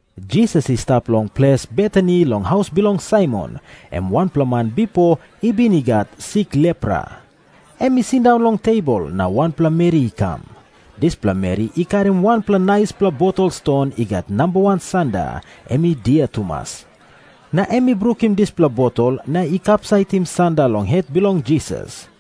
Jisas i stap long ples Betani long haus bilong Saimon, em wanpela man bipo i bin i gat sik lepra. Em i sindaun long tebol, na wanpela meri i kam. Dispela meri i karim wanpela naispela botol ston i gat nambawan sanda, em i dia tumas. Na em i brukim dispela botol na i kapsaitim sanda long het bilong Jisas.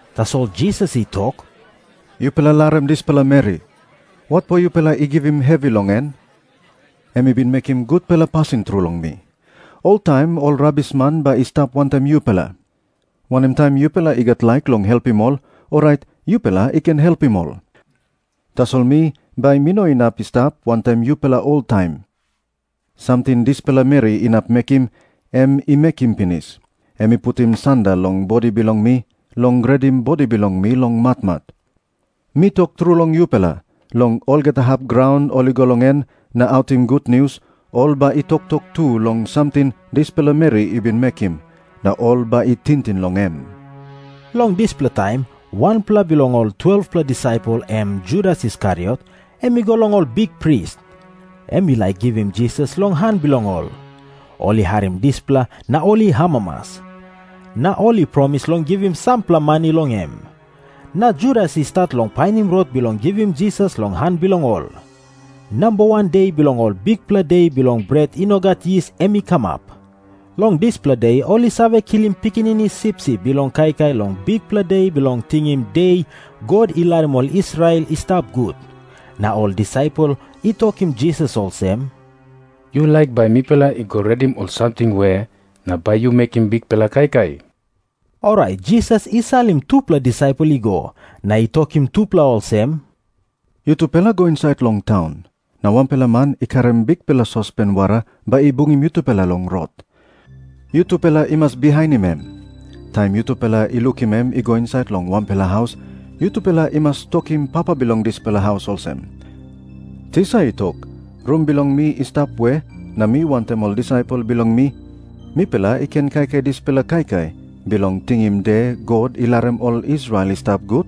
Tasol Jisas i tok, “Yupela larim dispela meri. Watpo yupela i givim hevi long en? Em i bin mekim gutpela pasin tru long mi. Oltaim ol rabisman bai i stap wantaim yupela. Wanem taim yupela i gat laik long helpim ol, orait yupela i ken helpim ol. Tasol mi, bai mi no inap i stap wantaim yupela oltaim. Samting dispela meri inap mekim, em i mekim pinis. Em i putim sanda long bodi bilong mi bilong redim bodi bilong mi long matmat. Mi tok tru long yupela, long olgeta hap graun ol i go long en na autim gutnius, ol bai i toktok tu long samting dispela meri i bin mekim, na ol bai i tingting long em.” Long dispela taim wanpela bilong ol 12-pela disaipel, em Judas Iskariot, em i go long ol bikpris. Em i laik givim Jisas long han bilong ol. Ol i harim dispela na ol i amamas. Na ol i promis long givim sampela mani long em. Na Judas i stat long painim rot bilong givim Jisas long han bilong ol. Namba wan de bilong Ol Bikpela De Bilong Bret I No Gat Yis em i kamap. Long dispela de ol i save kilim pikinini sipsip bilong kaikai long Bikpela De Bilong Tingim De God I Larim Ol Israel I Stap Gut. Na ol disaipel i tokim Jisas olsem, “Yu laik bai mipela i go redim ol samting we na bai yu mekim bikpela kaikai?” Orait Jisas i salim tupela disaipel i go, na i tokim tupela olsem, “Yutupela go insait long taun. Na wanpela man i karim bikpela sospen wara bai i bungim yutupela long rot. Yutupela i mas bihainim em. Taim yutupela i lukim em i go insait long wanpela haus, yutupela i mas tokim papa bilong dispela haus olsem, ‘Tisa i tok, “Rum bilong mi i stap we na mi wantaim ol disaipel bilong mi mipela i ken kaikai dispela kaikai bilong tingim De God I Larim Ol Israel I Stap Gut?” ’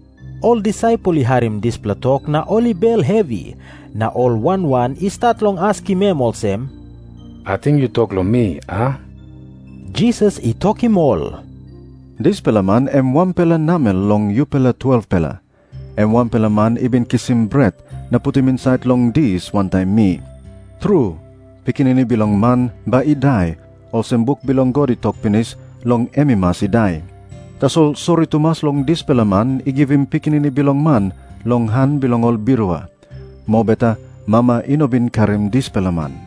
Ol disaipel i harim dispela tok na ol i bel hevi, na ol wan wan i stat long askim em olsem, “Ating yu tok long mi, a?” Jisas i tokim ol, “Dispela man em wanpela namel long yupela 12-pela. Em wanpela man i bin kisim bret na putim insait long dis wantaim mi. Tru, Pikinini Bilong Man bai i dai, olsem buk bilong God i tok pinis long em i mas i dai. Tasol sori tumas long dispela man i givim Pikinini Bilong Man long han bilong ol birua. Mobeta mama i no bin karim dispela man.”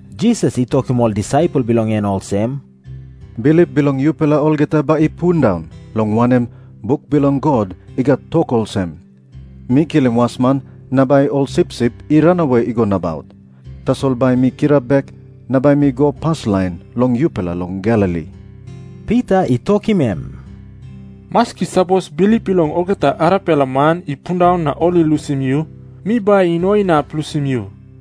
Jisas i tokim ol disaipel bilong en olsem, “Bilip bilong yupela olgeta bai i pundaun, long wanem, buk bilong God i gat tok olsem, ‘Mi kilim wasman, na bai ol sipsip i ranawe i go nabaut.’ Tasol bai mi kirap bek, na bai mi go paslain long yupela long Galili.” Pita i tokim em, “Maski sapos bilip bilong olgeta arapela man i pundaun na ol i lusim yu, mi bai i no inap lusim yu.”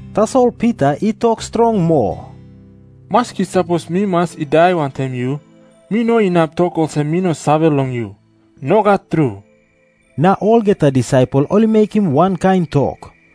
Tasol Pita i tok strong moa, “Maski sapos mi mas i dai wantaim yu, mi no inap tok olsem mi no save long yu. Nogat tru.” Na olgeta disaipel ol i mekim wankain tok.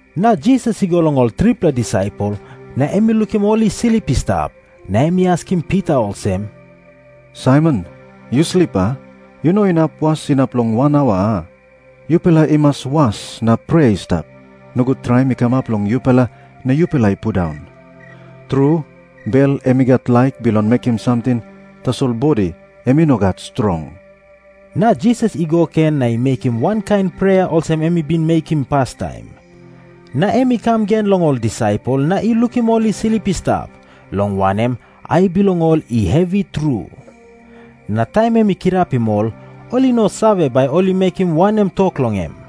Na Jisas i go long ol tripela disaipel, na em i lukim ol i slip i stap. Na em i askim Pita olsem, “Saimon, yu slip, a? Yu no inap was inap long wan aua, a? Yupela i mas was na prea i stap. Nogut traim i kamap long yupela na yupela i pundaun. Tru, bel em i gat laik bilong mekim samting, tasol bodi em i no gat strong.” Na Jisas i go gen na i mekim wankain prea olsem em i bin mekim pastaim. Na em i kam gen long ol disaipel na i lukim ol i slip i stap, long wanem, ai bilong ol i hevi tru. Na taim em i kirapim ol, ol i no save, bai ol i mekim wanem tok long em.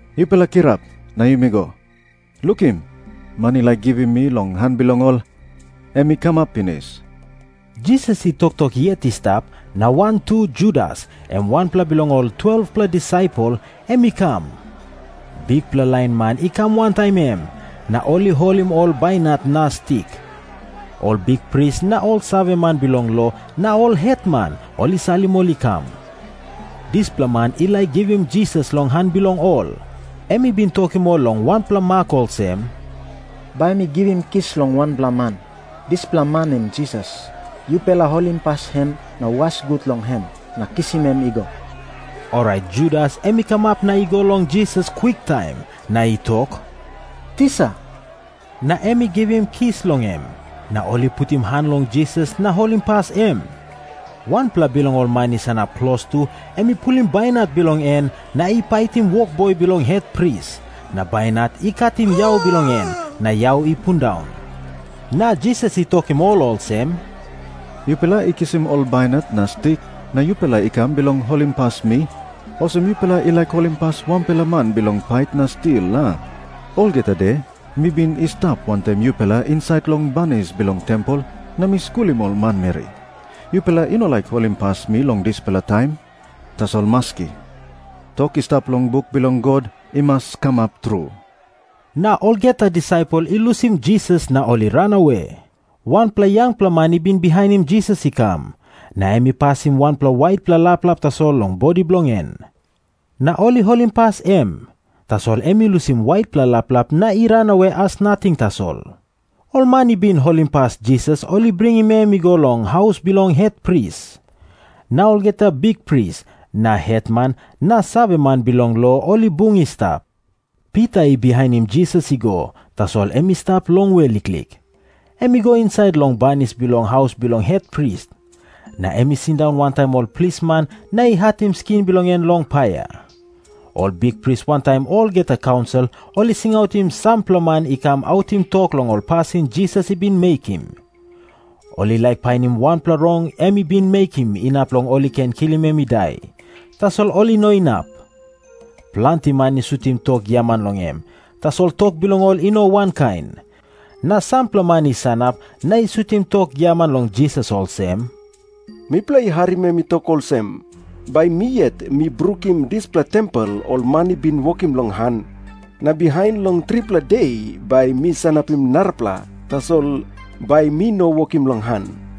Yupela kirap, na yumi go. Lukim, man i laik givim mi long han bilong ol, em i kamap pinis.” Jisas i toktok yet i stap, na wantu Judas, em wanpela bilong ol 12-pela disaipel, em i kam. Bikpela lain man i kam wantaim em, na ol i holim ol bainat na stik. Ol bikpris na ol saveman bilong lo na ol hetman ol i salim ol i kam. Dispela man i laik givim Jisas long han bilong ol, em i bin tokim ol long wanpela mak olsem, “Bai mi givim kis long wanpela man. Dispela man em Jisas. Yupela holimpas em, na was gut long em, na kisim em i go.” Orait Judas em i kamap na i go long Jisas kwiktaim, na i tok, “Tisa.” Na em i givim kis long em. Na ol i putim han long Jisas na holimpas em. Wanpela bilong ol man i sanap klostu, em i pulim bainat bilong en na i paitim wokboi bilong hetpris, na bainat i katim yau bilong en na yau i pundaun. Na Jisas i tokim ol olsem, “Yupela i kisim ol bainat na stik na yupela i kam bilong holimpas mi, olsem yupela i laik holimpas wanpela man bilong pait na stil, a? Olgeta de mi bin i stap wantaim yupela insait long banis bilong tempel na mi skulim ol manmeri. Yupela i no laik holimpas mi long dispela taim? Tasol maski. Tok i stap long buk bilong God i mas kamap tru.” Na olgeta disaipel i lusim Jisas na ol i ranawe. Wanpela yangpela man i bin bihainim Jisas i kam, na em i pasim wanpela waitpela laplap tasol long bodi bilong en. Na ol i holimpas em, tasol em i lusim waitpela laplap na i ranawe as nating tasol. Ol man i bin holimpas Jisas ol i bringim em i go long haus bilong hetpris. Na olgeta bikpris na hetman na saveman bilong lo ol i bung i stap. Pita i bihainim Jisas i go, tasol em i stap longwe liklik. Em i go insait long banis bilong haus bilong hetpris. Na em i sindaun wantaim ol plisman na i hatim skin bilong en long paia. Ol bikpris wantaim olgeta kaunsil ol i singautim sampela man i kam autim tok long ol pasin Jisas i bin mekim. Ol i laik painim wanpela rong em i bin mekim inap long ol i ken kilim em i dai, tasol ol i no inap. Planti man i sutim tok giaman long em, tasol tok bilong ol i no wankain. Na sampela man i sanap na i sutim tok giaman long Jisas olsem, “Mipela i harim em i tok olsem, ‘Bai mi yet mi brukim dispela tempel ol man i bin wokim long han. Na bihain long tripela de bai mi sanapim narapela, tasol bai mi no wokim long han.’”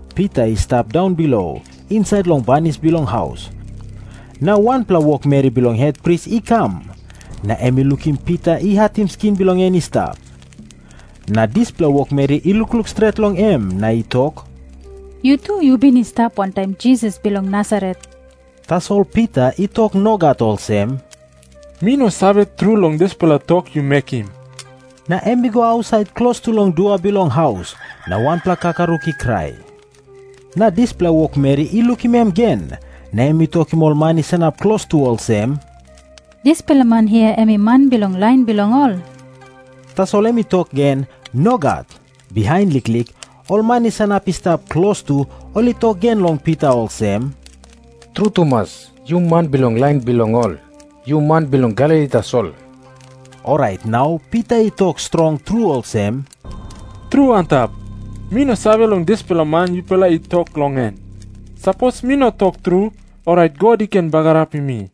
Pita i stap daunbilo, insait long banis bilong haus. Na wanpela wokmeri bilong hetpris i kam, na em i lukim Pita i hatim skin bilong en i stap. Na dispela wokmeri i lukluk stret long em, na i tok, “Yu tu yu bin i stap wantaim Jisas bilong Nasaret.” Tasol Pita i tok nogat olsem, “Mi no save tru long dispela tok yu mekim.” Na em i go ausait klostu long dua bilong haus. Na wanpela kakaruk i krai. Na dispela wokmeri i lukim em gen, na em i tokim ol man i sanap klostu olsem, “Dispela man hia em i man bilong lain bilong ol.” Tasol em i tok gen, “Nogat.” Bihain liklik, ol man i sanap i stap klostu ol i tok gen long Pita olsem, “Tru tumas, yu man bilong lain bilong ol. Yu man bilong Galili tasol.” Orait nau Pita i tok strong tru olsem, “Tru antap, mi no save long dispela man yupela i tok long en. Sapos mi no tok tru, orait God i ken bagarapim mi.”